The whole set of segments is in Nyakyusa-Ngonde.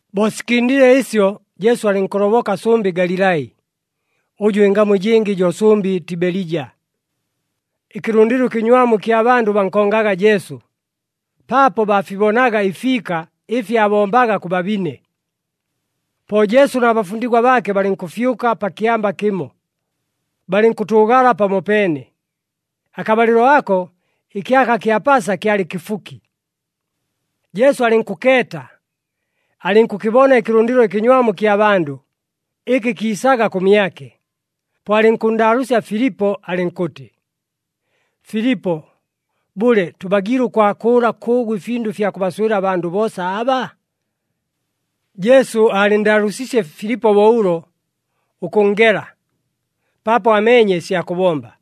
Bo sikɨndile ɨsyo, Jesu alɨnkʉloboka sʉmbɨ Galilai, ʉjʉ ɨngamu ɨjɨngɨ jo sʉmbɨ Tibelija. Ɨkɨlʉndɨlo ɨkɨnywamu ɨkya bandʉ bankongaga Jesu, paapo baafibonaga ɨfiika ɨfi aabombaga kʉ babine. Po Jesu na bafundigwa baake balɨnkʉfyʉka pa kyamba kɨmo, balɨnkʉtʉʉgala pamopeene. Akabalɨlo ako, ɨkyaka kya Pasa kyalɨ kɨfuki. Jesu alɨnkʉkeeta, alɨnkʉkɨbona ɨkɨlʉndɨlo ɨkɨnywamu ɨkya bandʉ, ɨkɨ kiisaga kʉmyake. Po alɨnkʉnndaalʉʉsya Filipo alɨnkʉtɨ, “Filipo, bʉle, tʉbagiile ʉkwakʉʉla kʉʉgʉ ɨfindʉ ɨfya kʉbaswɨla abandʉ boosa aba?” Jesu aalɨnndaalʉʉsiisye Filipo bo ʉlo, ʉkʉnngela, paapo aameenye ɨsya kʉbomba.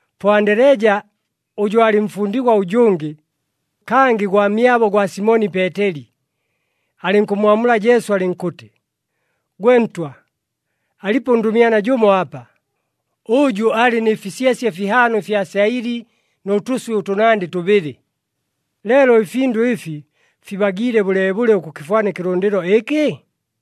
Po Andeleja, ʉjʉ aalɨ mfundigwa ʉjʉngɨ, kangɨ gwamyabo gwa Simoni Peeteli, alɨnkʉmmwamula Jesu alɨnkʉtɨ, “Gwe Ntwa, alipo ʉndʉmyana jʉmo apa, ʉjʉ alɨ nɨ fisyesye fihaano ɨfya syaɨli nʉ tʉswɨ ʉtʉnandɨ tʉbɨlɨ. Leelo ɨfindʉ ɨfi fibagiile bʉleebʉle ʉkʉkɨfwana ɨkɨlʉndɨlo ɨkɨ?”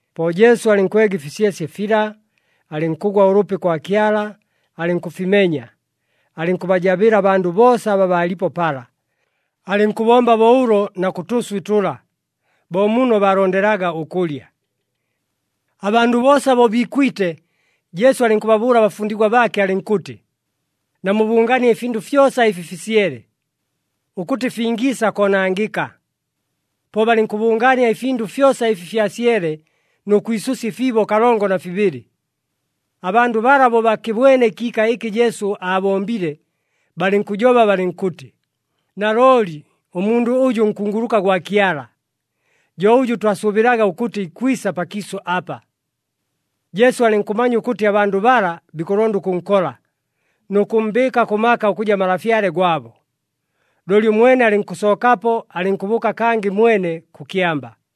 Po Jesu alɨnkwega ɨfisyesye fila, alɨnkʉgwa ʉlʉpi kwa Kyala, alɨnkʉfimenya, alɨnkʉbajabɨla abandʉ boosa aba baalipo pala. Alɨnkʉbomba bo ʉlo na kʉ tʉswɨ tʉla, bo muno baalondelaga ʉkʉlya. Abandʉ boosa bo biikwite, Jesu alɨnkʉbabʉʉla abafundigwa baake alɨnkʉtɨ, “Namubʉngaanie ɨfindʉ fyosa ɨfi fisyele, ʉkʉtɨ fingiisa koonangɨka.” Po balɨnkʉbʉngaania ɨfindʉ fyosa ɨfi fyasyele nʉ kwisʉsya ɨfiibo kalongo na fibɨlɨ. Abandʉ bala bo bakɨbwene ɨkiika ɨkɨ Jesu aabombile, balɨnkʉjoba balɨnkʉtɨ, “Nalooli ʉmundʉ ʉjʉ nkunguluka gwa Kyala, jo ʉjʉ twasʉʉbɨlaga ʉkʉtɨ ikwisa pakiisʉ apa.” Jesu alɨnkʉmanya ʉkʉtɨ abandʉ bala bikʉlonda ʉkʉnkola, nʉ kʉmmbɨɨka kʉ maka ʉkʉja Malafyale gwabo. Looli ʉmwene alɨnkʉsookapo alɨnkʉbʉʉka kangɨ mwene kʉ kyamba.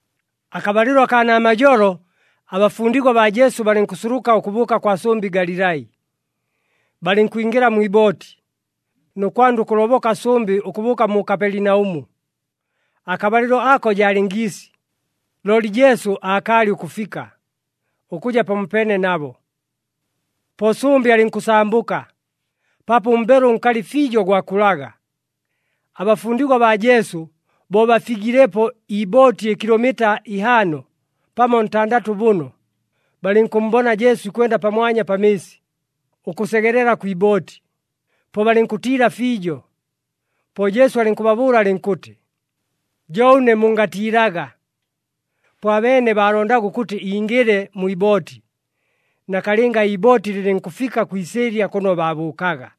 Akabalɨlo akaa namajolo, abafundigwa baa Jesu balɨnkʉsuluka ʉkʉbʉʉka kwa sʉmbɨ Galilai. Balɨnkwingɨla mwi ibooti, nʉ kwanda ʉkʉloboka sʉmbɨ ʉkʉbʉʉka mu Kapelinaʉmu. Akabalɨlo ako jaalɨ ngiisi, looli Jesu aakaalɨ ʉkʉfika, ʉkʉja pamopeene nabo. Po sʉmbɨ alɨnkʉsambʉka, paapo ʉmbelo ʉnkalɨ fiijo gwakulaga. Abafundigwa baa Jesu bo bafigilepo iibooti ɨkilomita ihaano, pamo ntandatʉ bʉno, balɨnkʉmmbona Jesu ikwenda pamwanya pa mɨɨsi, ʉkʉsegelela kwi ibooti, po balɨnkʉtiila fiijo. Po Jesu alɨnkʉbabʉʉla alɨnkʉtɨ, “Jo ʉne! Mungatiilaga!” Po abeene baalondaga ʉkʉtɨ ingɨle mwi ibooti. Nakalɨnga iibooti lɨlɨnkʉfika kwi isɨɨlya kʉno baabʉʉkaga.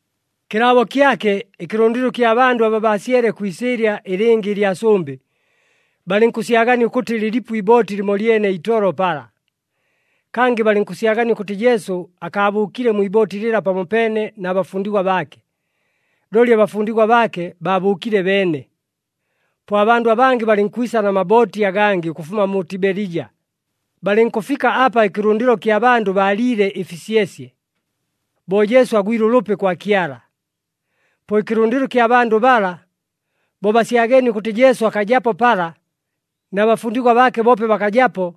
Kɨlaabo kyake, ɨkɨlʉndɨlo ɨkya bandʉ aba baasyele kwi isɨɨlya ɨlɨngɨ ɨlya sʉmbɨ, balɨnkʉsyagania ʉkʉtɨ lɨlipo iibooti lɨmolyene itolo pala. Kangɨ balɨnkʉsyagania ʉkʉtɨ Jesu akaabʉʉkile mwi ibooti lɨla pamopeene na bafundigwa baake, looli abafundigwa baake baabʉʉkile beene. Po abandʉ abangɨ balɨnkwisa na mabooti agangɨ ʉkʉfuma mu Tibelija, balɨnkʉfika apa ɨkɨlʉndɨlo kya bandʉ baaliile ɨfisyesye, bo Jesu agwile ʉlʉpi kwa Kyala. Po ɨkɨlʉndɨlo ɨkya bandʉ bala, bo basyageenie ʉkʉtɨ Jesu akajapo pala, na bafundigwa baake boope bakajapo,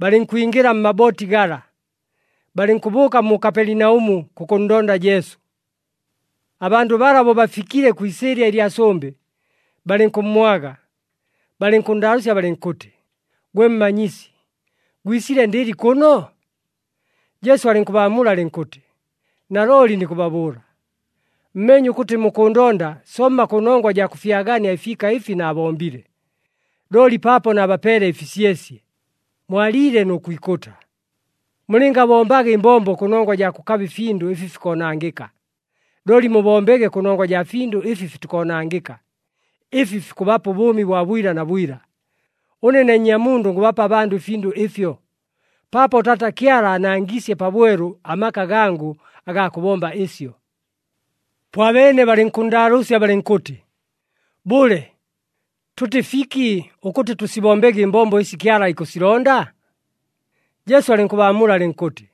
balɨnkwingɨla mmabooti gala, balɨnkʉbʉʉka mu Kapelinaʉmu kʉkʉnndonda Jesu. Abandʉ bala bo bafikile kwi isɨɨlya ɨlya sʉmbɨ, balɨnkʉmmwaga, balɨnkʉnndaalʉʉsya balɨnkʉtɨ, “Gwe Mmanyisi, gwisile ndɨli kʉno?” Jesu alɨnkʉbaamula alɨnkʉtɨ, “Nalooli nikʉbabʉʉla, mmeenye ʉkʉtɨ mukʉʉndonda somma kʉnongwa jaa kʉfyagania ɨfiika ɨfi naabombile, looli paapo naabapeele ɨfisyesye, mwaliile nʉ kwikʉta. Mulɨngabombaga ɨmbombo kʉnongwa jaa kʉkaba ɨfindʉ ɨfi fikoonangɨka, looli mubombege kʉnongwa jaa findʉ ɨfi fitikoonangɨka, ɨfi fikʉbapa ʉbʉʉmi bwa bwila na bwila. Ʉne ne Nnyamundʉ ngʉbapa abandʉ ɨfindʉ ɨfyo, paapo Taata Kyala aanangiisye pabwelu amaka gangʉ agaa kʉbomba ɨsyo.” Po abeene balɨnkʉnndaalʉʉsya balɨnkʉtɨ, “Bʉle, tʉtɨ fiki ʉkʉtɨ tʉsibombege ɨmbombo ɨsi Kyala ikʉsilonda?” Jesu alɨnkʉbaamula alɨnkʉtɨ,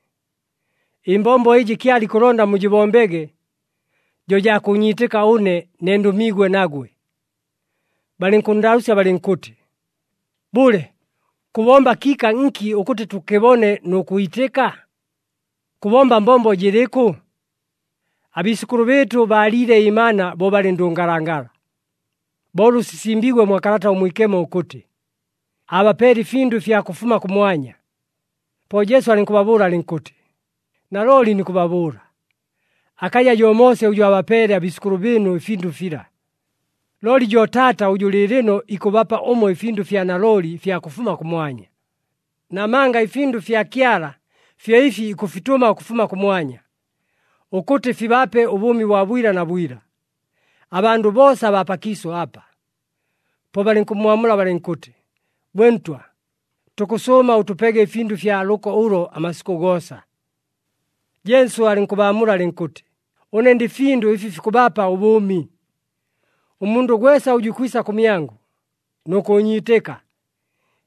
“Ɨmbombo ɨjɨ Kyala ikʉlonda mujɨbombege, jo jaa kʉʉnyiitɨka ʉne, ne ndʉmiigwe nagwe.” Balɨnkʉnndaalʉʉsya balɨnkʉtɨ, “Bʉle, kʉbomba kiika nki ʉkʉtɨ tʉkɨbone, nʉ kwitɨka? Kʉbomba mbombo jɨlɨkʉ? Abiisʉkʉlʉ bɨɨtʉ baaliile ɨmana bo balɨ ndʉngalangala, bo ʉlʉ sisimbiigwe mwa Kalata ʉMwikemo ʉkʉtɨ, ‘Aabapeele ɨfindʉ ɨfya kʉfuma kʉmwanya.’” Po Jesu alɨnkʉbabʉʉla alɨnkʉtɨ, “Nalooli nikʉbabʉʉla, akaja jo Moose ʉjʉ aabapeele abiisʉkʉlʉ bɨɨnu ɨfindʉ fila, looli jo Taata ʉjʉ lɨɨlɨno ikʉbapa ʉmwe ɨfindʉ ɨfya nalooli ɨfya kʉfuma kʉmwanya. Namanga ɨfindʉ ɨfya Kyala fyo ɨfi ikʉfitʉma ʉkʉfuma kʉmwanya, ʉkʉtɨ fibape ʉbʉʉmi bwa bwila na bwila, abandʉ boosa abaa pakiisʉ apa.” Po balɨnkʉmmwamula balɨnkʉtɨ, “Gwe Ntwa, tukʉsʉʉma ʉtʉpege ɨfindʉ ɨfya lʉko ʉlo amasikʉ goosa.” Jesu alɨnkʉbaamula alɨnkʉtɨ, “Ʉne ndɨ findʉ ɨfi fikʉbapa ʉbʉʉmi. Ʉmundʉ gwesa ʉjʉ ikwisa kʉmyangʉ, nʉ kʉʉnyiitɨka,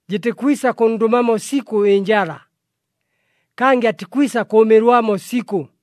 jɨtikwisa kʉnndʉmamo sikʉ ɨnjala, kangɨ atikwisa kʉʉmɨlwamo sikʉ.”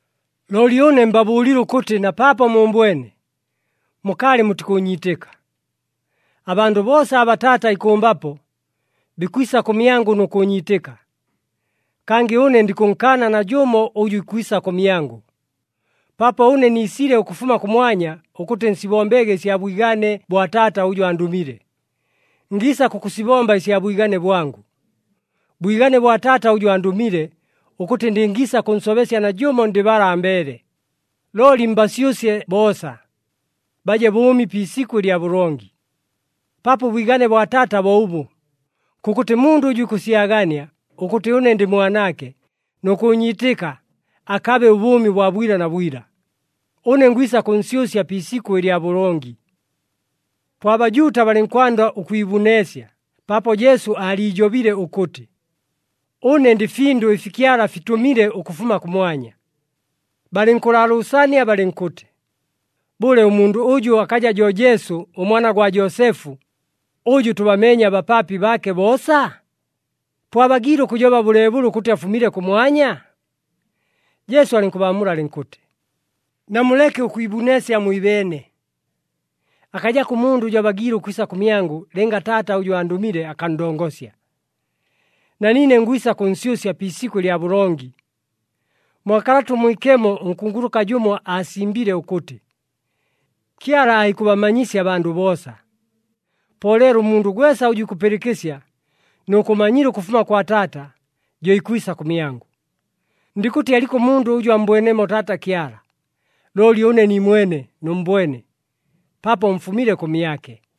“Looli ʉne mbabʉʉlile ʉkʉtɨ na paapo muumbwene, mukaalɨ mutikʉʉnyiitɨka. Abandʉ boosa aba Taata ikʉmbapo, bikwisa kʉmyangʉ nʉ kʉʉnyiitɨka. Kangɨ ʉne ndikʉnkaana najʉmo ʉjʉ ikwisa kʉmyangʉ. Paapo ʉne niisile ʉkʉfuma kʉmwanya ʉkʉtɨ nsibombege ɨsya bwigane bwa Taata ʉjʉ andʉmile. Ngiisa kʉkʉsibomba ɨsya bwigane bwangʉ. Bwigane bwa Taata ʉjʉ andʉmile, ʉkʉtɨ ndɨngiisa kʉnsobesya najʉmo ndɨ bala ambeele, looli mbasyʉsye boosa, baje bʉʉmi pi isikʉ lya bʉlongi. Paapo ʉbwigane bwa Taata bo ʉbʉ, kʉkʉtɨ mundʉ ʉjʉ ikʉsyagania ʉkʉtɨ ʉne ndɨ Mwanaake, nʉ kʉʉnyiitɨka, akabe ʉbʉʉmi bwa bwila na bwila. Ʉne ngwisa kʉnsyʉsya pi isikʉ lya bʉlongi.” Po aBajuuta balɨnkwanda ʉkwibuneesya paapo Jesu aaliijobile ʉkʉtɨ, “Ʉne ndɨ findʉ ɨfi Kyala afitʉmile ʉkʉfuma kʉmwanya.” Balɨnkʉlaalʉʉsania balɨnkʉtɨ, “Bʉle, ʉmundʉ ʉjʉ akaja jo Jesu, ʉmwana gwa Joosefu, ʉjʉ tʉbameenye abapaapi baake boosa? Po abagiile ʉkʉjoba bʉleebʉle ʉkʉtɨ afumile kʉmwanya?” Jesu alɨnkʉbaamula alɨnkʉtɨ, “Namuleke ʉkwibuneesya mwibeene. Akajako ʉmundʉ ʉjʉ abagiile ʉkwisa kʉmyangʉ, lɨnga Taata ʉjʉ andʉmile akanndongosya. Na niine ngwisa kʉnsyʉsya pi isikʉ lya bʉlongi. Mwa Kalata ʉMwikemo ʉnkunguluka jʉmo aasimbile ʉkʉtɨ, ‘Kyala aikʉbamanyisya abandʉ boosa.’ Po leelo ʉmundʉ gwesa ʉjʉ ikʉpɨlɨkɨsya nʉ kʉmanyila ʉkʉfuma kwa Taata, jo ikwisa kʉmyangʉ. Ndikʉtɨ aliko ʉmundʉ ʉjʉ ammbwenemo Taata Kyala. Looli ʉne niimwene nʉmmbwene, paapo mfumile kʉmyake.”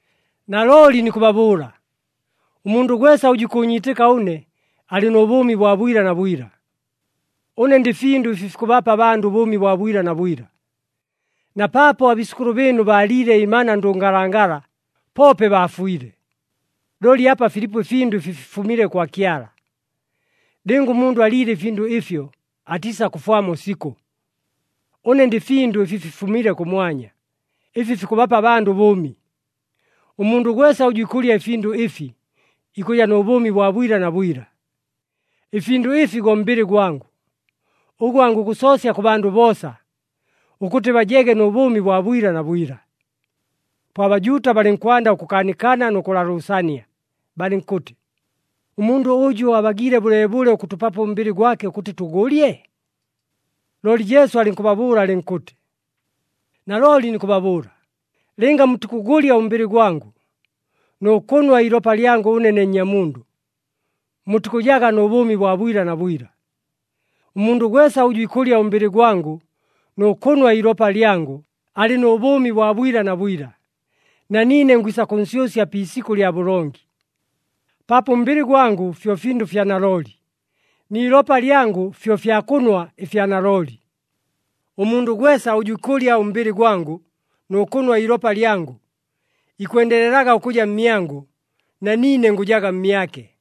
“Nalooli nikʉbabʉʉla, ʉmundʉ gwesa ʉjʉ ikʉʉnyiitɨka ʉne, alɨ nʉ bʉʉmi bwa bwila na bwila. Ʉne ndɨ findʉ ɨfi fikʉbapa abandʉ ʉbʉʉmi bwa bwila na bwila. Na paapo abiisʉkʉlʉ bɨɨnu baaliile ɨmana ndʉngalangala, poope baafwile. Looli apa filipo ɨfindʉ ɨfi fifumile kwa Kyala. Lɨnga ʉmundʉ aliile ɨfindʉ ɨfyo, atiisakʉfwamo sikʉ. Ʉne ndɨ findʉ ɨfi fifumile kʉmwanya, ɨfi fikʉbapa abandʉ ʉbʉʉmi. Ʉmundʉ gwesa ʉjʉ ikʉlya ɨfindʉ ɨfi, ikʉja nʉ bʉʉmi bwa bwila na bwila. Ɨfindʉ ɨfi go mbɨlɨ gwangʉ, ʉgʉ angʉgʉsoosya kʉ bandʉ boosa, ʉkʉtɨ bajege nʉ bʉʉmi bwa bwila na bwila.” Po aBajuuta balɨnkwanda ʉkʉkaanikana nʉ kʉlaalʉʉsania, balɨnkʉtɨ, “Ʉmundʉ ʉjʉ abagiile bʉleebʉle ʉkʉtʉpapo ʉmbɨlɨ gwake, ʉkʉtɨ tʉgʉlye?” Looli Jesu alɨnkʉbabʉʉla alɨnkʉtɨ, “Nalooli nikʉbabʉʉla, lɨnga mutikʉgʉlya ʉmbɨlɨ gwangʉ, nʉ kʉnwa iilopa lyangʉ ʉne ne Nnyamundʉ, mutikʉjaga nʉ bʉʉmi bwa bwila na bwila. Ʉmundʉ gwesa ʉjʉ ikʉlya ʉmbɨlɨ gwangʉ nʉ kʉnwa iilopa lyangʉ, alɨ nʉ bʉʉmi bwa bwila na bwila, na niine ngwisa kʉnsyʉsya pi isikʉ lya bʉlongi. Paapo ʉmbɨlɨ gwangʉ fyo findʉ fya nalooli, ni ilopa lyangʉ fyo fya kʉnwa ɨfya nalooli. Ʉmundʉ gwesa ʉjʉ ikʉlya ʉmbɨlɨ gwangʉ nʉ kʉnwa iilopa lyangʉ, ikwendelelaga ʉkʉja mmyangʉ na niine ngʉjaga mmyake.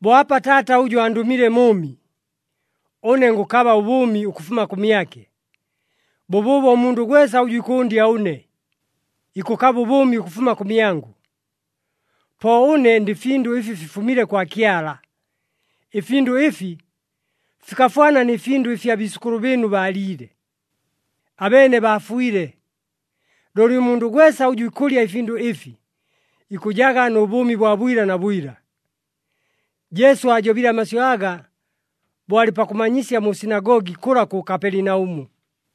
“Bo apa Taata ʉjʉ andʉmile mʉʉmi, ʉne ngʉkaba ʉbʉʉmi ʉkʉfuma kʉmyake. Bʉbʉʉbo ʉmundʉ gwesa ʉjʉ ikʉʉndya ʉne, ikʉkaba ʉbʉʉmi ʉkʉfuma kʉmyangʉ. Po ʉne ndɨ findʉ ɨfi fifumile kwa Kyala. Ɨfindʉ ɨfi, fikafwana nɨ findʉ ɨfi abiisʉkʉlʉ bɨɨnu baaliile. Abeene baafwile. Looli ʉmundʉ gwesa ʉjʉ ikʉlya ɨfindʉ ɨfi, ikʉjaga nʉ bʉʉmi bwa bwila na bwila.” Jesu aajobile amasyʉ aga bo alɨ pakʉmanyisya mu sinagogi, kʉla kʉ Kapelinaʉmu.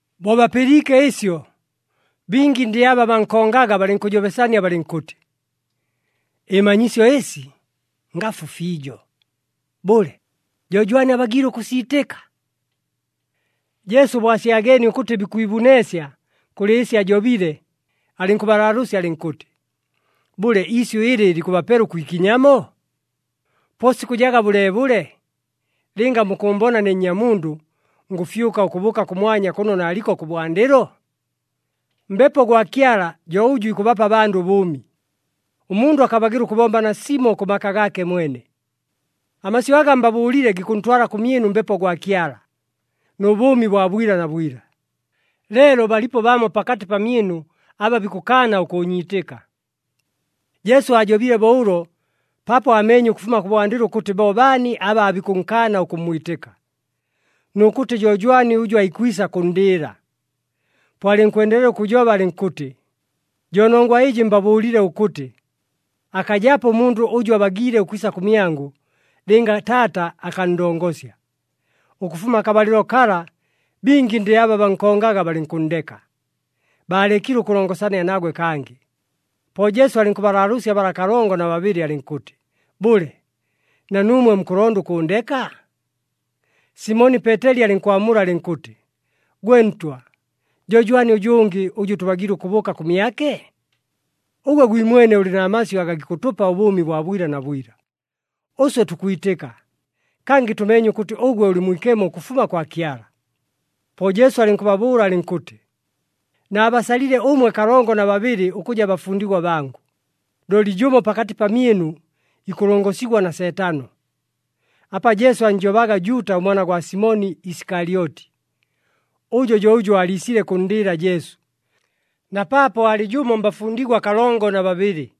Bo bapɨliike ɨsyo, bingi ndɨ aba bankongaga balɨnkʉjobesania balɨnkʉtɨ, “Ɨmanyisyo ɨsi ngafu fiijo! Bʉle, jo jwani abagiile ʉkʉsiitɨka?” Jesu bo asyageenie ʉkʉtɨ bikwibuneesya kʉlɨ ɨsi ajobile, alɨnkʉbalaalʉʉsya alɨnkʉtɨ, “Bʉle, isyʉ ɨlɨ likʉbapela ʉkwikinyamo? Po sikʉjaga bʉleebʉle, lɨnga mukʉʉmbona ne Nnyamundʉ, ngʉfyʉka ʉkʉbʉʉka kʉmwanya kʉno naaliko kʉbwandɨlo? Mbepo gwa Kyala jo ʉjʉ ikʉbapa abandʉ ʉbʉʉmi. Ʉmundʉ akabagɨla ʉkʉbomba nasimo kʉ maka gaake mwene. Amasyʉ aga mbabʉʉlile gikʉntwala kʉmyɨnu Mbepo gwa Kyala, nʉ bʉʉmi bwa bwila na bwila. Leelo balipo bamo pakatɨ pamyɨnu aba bikʉkaana ʉkʉʉnyiitɨka.” Jesu aajobile bo ʉlo paapo aameenye ʉkʉfuma kʉbwandɨlo ʉkʉtɨ bo baani aba aabikʉnkaana ʉkʉmmwitɨka, nʉ kʉtɨ jo jwani ʉjʉ aikwisa kʉnndɨɨla. Po alɨnkwendelela ʉkʉjoba alɨnkʉtɨ, “Jo nongwa ɨjɨ mbabʉʉlile ʉkʉtɨ, akajapo ʉmundʉ ʉjʉ abagiile ʉkwisa kʉmyangʉ, lɨnga Taata akanndongosya.” Ʉkʉfuma akabalɨlo kala, bingi ndɨ aba bankongaga balɨnkʉnndeka, baalekile ʉkʉlongosania nagwe kangɨ. Po Jesu alɨnkʉbalaalʉʉsya bala kalongo na babɨlɨ alɨnkʉtɨ, “Bʉle, na nuumwe mukʉlonda ʉkʉʉndeka?” Simoni Peeteli alɨnkwamula alɨnkʉtɨ, “Gwe Ntwa, jo jwani ʉjʉngɨ, ʉjʉ tʉbagiile ʉkʉbʉʉka kʉmyake? Ʉgwe gwimwene ʉlɨ na masyʉ aga gikʉtʉpa ʉbʉʉmi bwa bwila na bwila. Ʉswe tukwitɨka, kangɨ tʉmeenye ʉkʉtɨ ʉgwe ʉlɨ Mwikemo ʉkʉfuma kwa Kyala.” Po Jesu alɨnkʉbabʉʉla alɨnkʉtɨ, “Naabasalile ʉmwe kalongo na babɨlɨ ʉkʉja bafundigwa bangʉ, looli jʉmo pakatɨ pamyɨnu ikʉlongosigwa na Seetano.” Apa Jesu annjobaga Juuta ʉmwana gwa Simoni Isikalyoti. Ʉjo jo ʉjʉ aaliisile kʉnndɨɨla Jesu, na paapo alɨ jʉmo mbafundigwa kalongo na babɨlɨ.